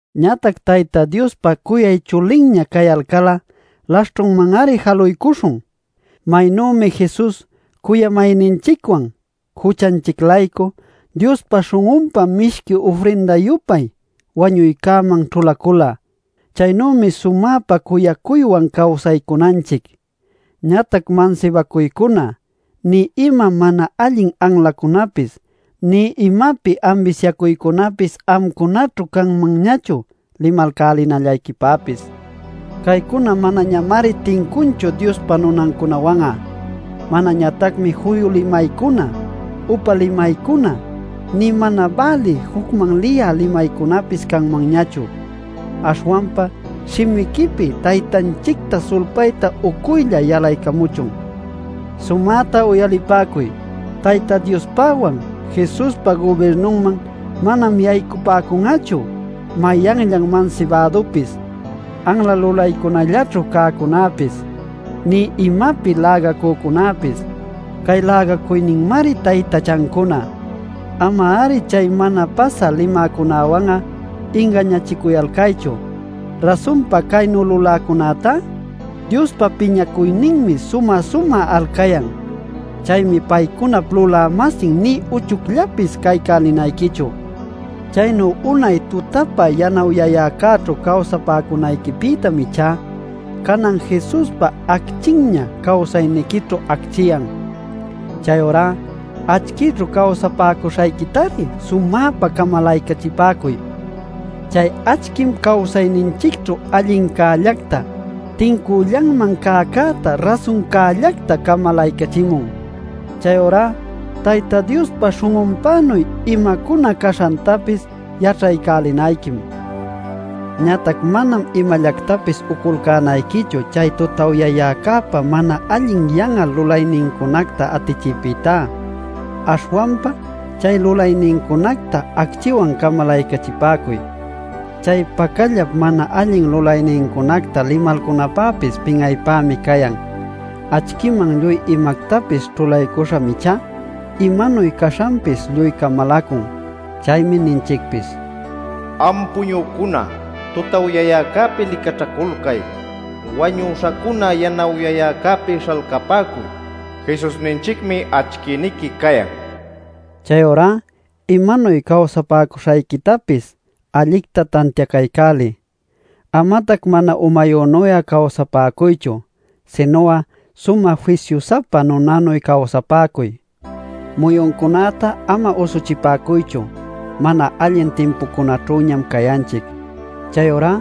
Ñatac Tayta Diospa cuyay chulinña cayalcal'a laśhćhunman-ari jaluycuśhun. Maynümi Jesus cuyamayninchicwan juchanchic-laycu Diospa śhun'unpa mishqui ufrinda-yupay wañuycäman ćhulacula, chaynümi sumäpa cuyacuywan cawsaycunanchic. Ñatac mansibacuycuna nï ima mana allin anlacunapis nï imapi ambisyacuycunapis amcunaćhu canmanñachu limalcälinallayquipäpis. Caycuna manañamari tincunchu Diospa nunancunawan'a. Manañatacmi juyu limaycuna, upa limaycuna, nï mana bälï jucman liyä limaycunapis canmanñachu. Aśhwanpa shimiquipi Taytanchicta sulpayta uycuylla yalaycamuchun. Sumäta uyalipäcuy: Tayta Diospäwan Jesuspa gubirnunman manam yaycapäcun'achu mayanllan mansibädupis, anla lulaycunallaćhu cäcunapis, nï imapi lägacücunapis. Cay lägacuyninmari taytachancuna. Ama-ari chay mana pasä limäcunawan'a ingañachicuyalcaychu. Rasunpa caynu luläcunätá Diospa piñacuyninmi sumä-sumä alcayan. Chaymi paycunap lulä-masin nï uchuyllapis caycälinayquichu. Chaynu unay tutapa yanawyayäcäćhu cawsapäcunayquipïtam ichá canan Jesuspa acchinña cawsayniquićhu acchiyan. Chayurá acchïchu cawsapäcuśhayquitari sumäpa camalaycachipäcuy. Chay acchim cawsayninchicćhu allincällacta, tincüllanman cäcäta, rasuncällacta camalaycachimun. Chayurá Tayta Diospa śhun'unpänuy imacuna caśhantapis yaćhaycälinayquim. Ñatac manam imallactapis uculcänayquichu chay tutawyayäcäpa mana allin yan'al lulaynincunacta atichiypïtá. Aśhwanpa chay lulaynincunacta acchïwan camalaycachipäcuy. Chay pacallap mana allin lulaynincunacta limalcunapäpis pin'aypämi cayan. Acchïman lluy imactapis ćhulaycuśham ichá imanuy caśhanpis lluy camalacun. Chaymi ninchicpis: “Am puñücuna tutawyayäcäpi licaćhaculcay, wañüśhacuna yanawyayäcäpi śhalcapäcuy. Jesusninchicmi acchïniqui cayan” nil. Chayurá imanuy cawsapäcuśhayquitapis allicta tantiacaycäliy. Amatac mana umayünuy'a cawsapäcuychu, sinu'a sumä fisyu-sapa nunanuy cawsapäcuy. Muyuncunäta ama usuchipäcuychu; mana allin timpucunaćhüñam cayanchic. Chayurá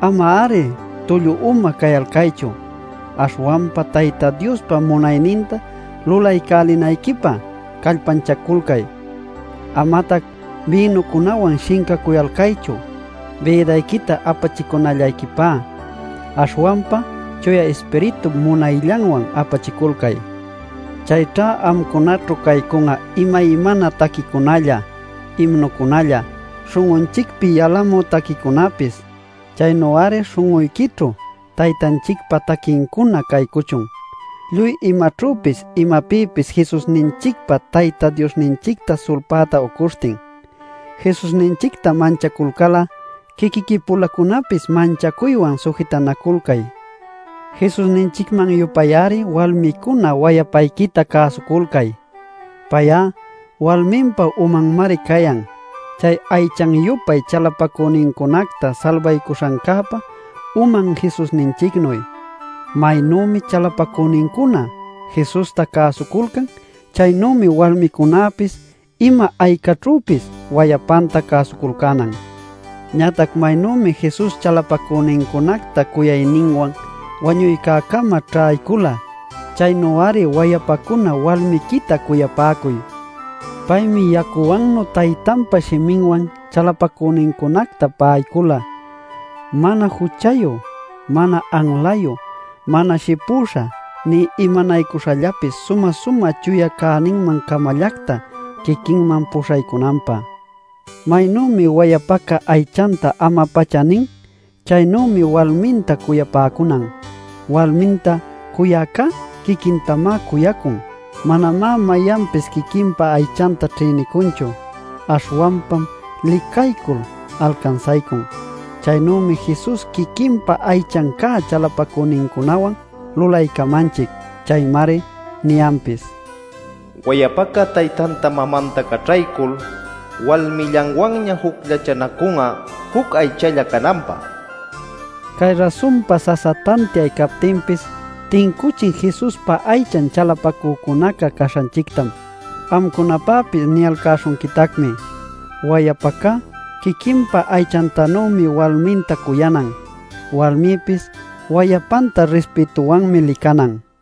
ama-ari tullu uma cayalcaychu. Aśhwanpa Tayta Diospa munayninta lulaycälinayquipä callpanchaculcay. Amatac bïnucunawan shincacuyalcaychu bïdayquita apachicunallayquipä. Aśhwanpa Chuya Ispiritup munayllanwan apachiculcay. Chayćha amcunaćhu caycun'a imaymana taquicunalla, imnucunalla, śhun'unchicpi yalamü taquicunapis. Chaynu-ari śhun'uyquićhu Taytanchicpa taquicuna caycuchun lluy imaćhüpis imapïpis Jesusninchicpa Tayta Diosninchicta sulpäta ucuśhtin. Jesusninchicta manchaculcal'a quiquiqui-pulacunapis manchacuywan sujitanaculcay. Jesusninchicman-yupay-ari walmicuna wayapayquita cäsuculcay. Pay'a walminpa umanmari cayan chay aychan-yupay chalapacünincunacta salbaycuśhancäpa uman Jesusninchicnuy. Maynümi chalapacünincuna Jesusta cäsuculcan, chaynümi walmicunäpis ima aycaćhüpis wayapanta cäsuculcänan. Ñatac maynümi Jesus chalapacünincunacta cuyayninwan wañuycäcama ćhaycula chaynu-ari wayapacuna walmiquita cuyapäcuy. Paymi yacuwannu Taytanpa shiminwan chalapacünincunacta pa'aycula mana juchayu, mana anlayu, mana shipüśha, nï imanaycuśhallapis sumä-sumä chuya cäninman-camallacta quiquinman puśhaycunanpä. Maynümi wayapaca aychanta ama-pacha nin, chaynümi walminta cuyapäcunan. Walminta cuyäcá quiquintamá cuyacun. Manamá mayanpis quiquinpa aychanta ćhïnicunchu. Aśhwanpam licaycul alcansaycun. Chaynümi Jesus quiquinpa aychan cä chalapacünincunawan lulaycamanchic. Chaymari niyanpis: “Wayapaca taytanta mamanta caćhaycul walmillanwanña jucllachanacun'a juc aychalla cananpä” nil. Cay rasunpa sasa tantiay captinpis tincuchin Jesuspa aychan chalapacücunaca caśhanchictam. Amcunapäpis niyalcäśhunquitacmi: wayapaca quiquinpa aychantanümi walminta cuyanan. Walmipis wayapanta rispïtuwanmi licanan.